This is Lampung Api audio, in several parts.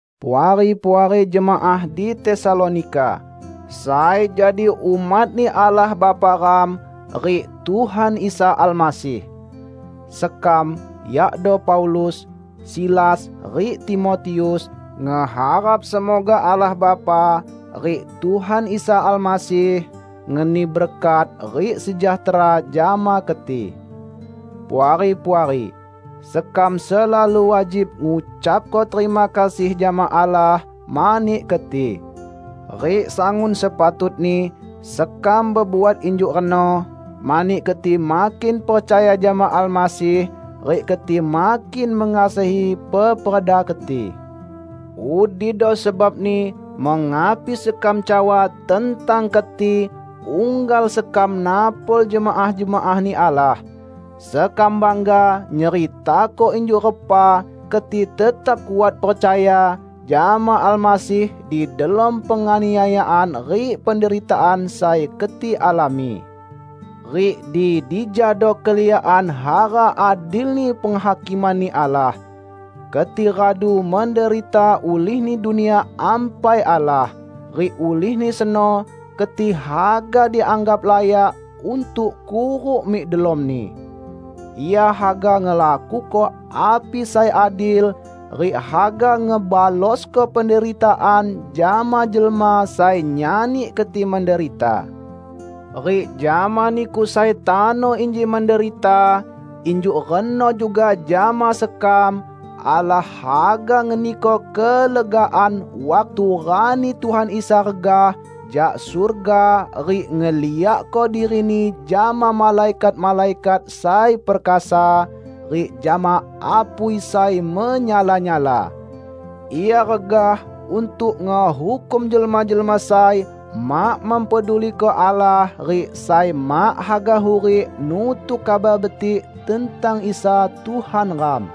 Puari-puari jemaah di Tesalonika, sai jadi umat-Ni Allah Bapa ram rik Tuhan Isa Almasih! Sekam, yakdo Paulus, Silas rik Timotius ngeharap semoga Allah Bapa rik Tuhan Isa Almasih ngeni berkat rik sejahtera jama keti. Puari-puari, sekam selalu wajib ngucapko terima kasih jama Allah mani keti. Rik sangun sepatutni sekam bebuat injuk reno, mani keti makin percaya jama Almasih, rik keti makin mengasihi peperda keti. Udido sebabni mengapi sekam cawa tentang keti unggal sekam napol jemaah-jemaah-Ni Allah. Sekam bangga nyeritako injuk repa keti tetap kuat percaya jama Almasih di delom penganiayaan rik penderitaan sai keti alami. Rik di dijado keliakan hara adilni penghakiman-Ni Allah: Keti radu menderita ulihni Dunia Ampai Allah, rik ulihni seno keti haga dianggap layak untuk kuruk mik delomni. Ia haga ngelakuko api sai adil, rik haga ngebalosko penderitaan jama jelma sai nyani keti menderita. Rik jama niku sai tano inji menderita -- injuk reno juga jama sekam -- Allah haga ngeniko kelegaan waktu rani Tuhan Isa regah jak surga rik ngeliakko diri-Ni jama malaikat-malaikat sai perkasa, rik jama apui sai menyala-nyala. Ia regah untuk ngehukum jelma-jelma sai mak mempeduliko Allah rik sai mak haga hurik nutuk Kabar Betik tentang Isa Tuhan ram.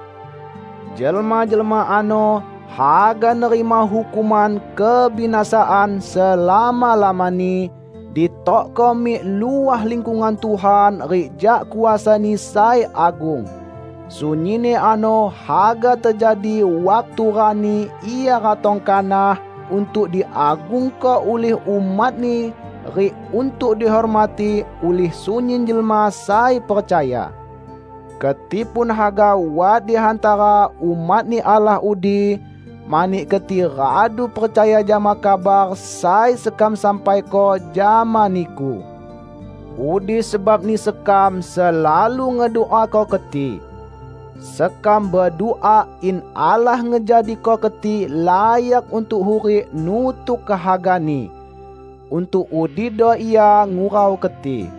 Jelma-jelma ano haga nerima hukuman kebinasaan selama-lamani, ditokko mik luah lingkungan Tuhan rik jak kuasa-Ni sai agung; sunyinni ano haga tejadi waktu rani Ia ratong kanah untuk diagungko ulih umat-Ni rik untuk dihormati ulih sunyin jelma sai percaya. Keti pun haga wat di hantara umat-Ni Allah udi, mani keti radu percaya jama kabar sai sekam sampaiko jama niku. Udi sebabni sekam selalu ngeduako keti. Sekam bedua in Allah ngejadiko keti layak untuk hurik nutuk kehaga-Ni; untuk udido Ia ngurau keti.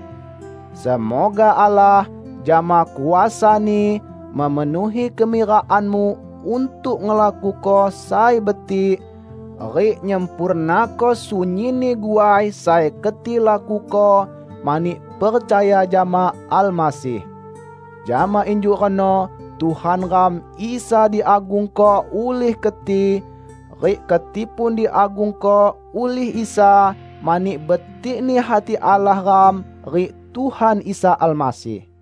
Semoga Allah, jama kuasa-Ni, memenuhi kemirakanmu untuk ngelakuko sai betik, rik nyempurnako sunyinni guai sai keti lakuko mani percaya jama Almasih. Jama injuk reno Tuhan ram Isa diagungko ulih keti, rik keti pun diagungko ulih Isa mani betik-Ni hati Allah ram rik Tuhan Isa Almasih.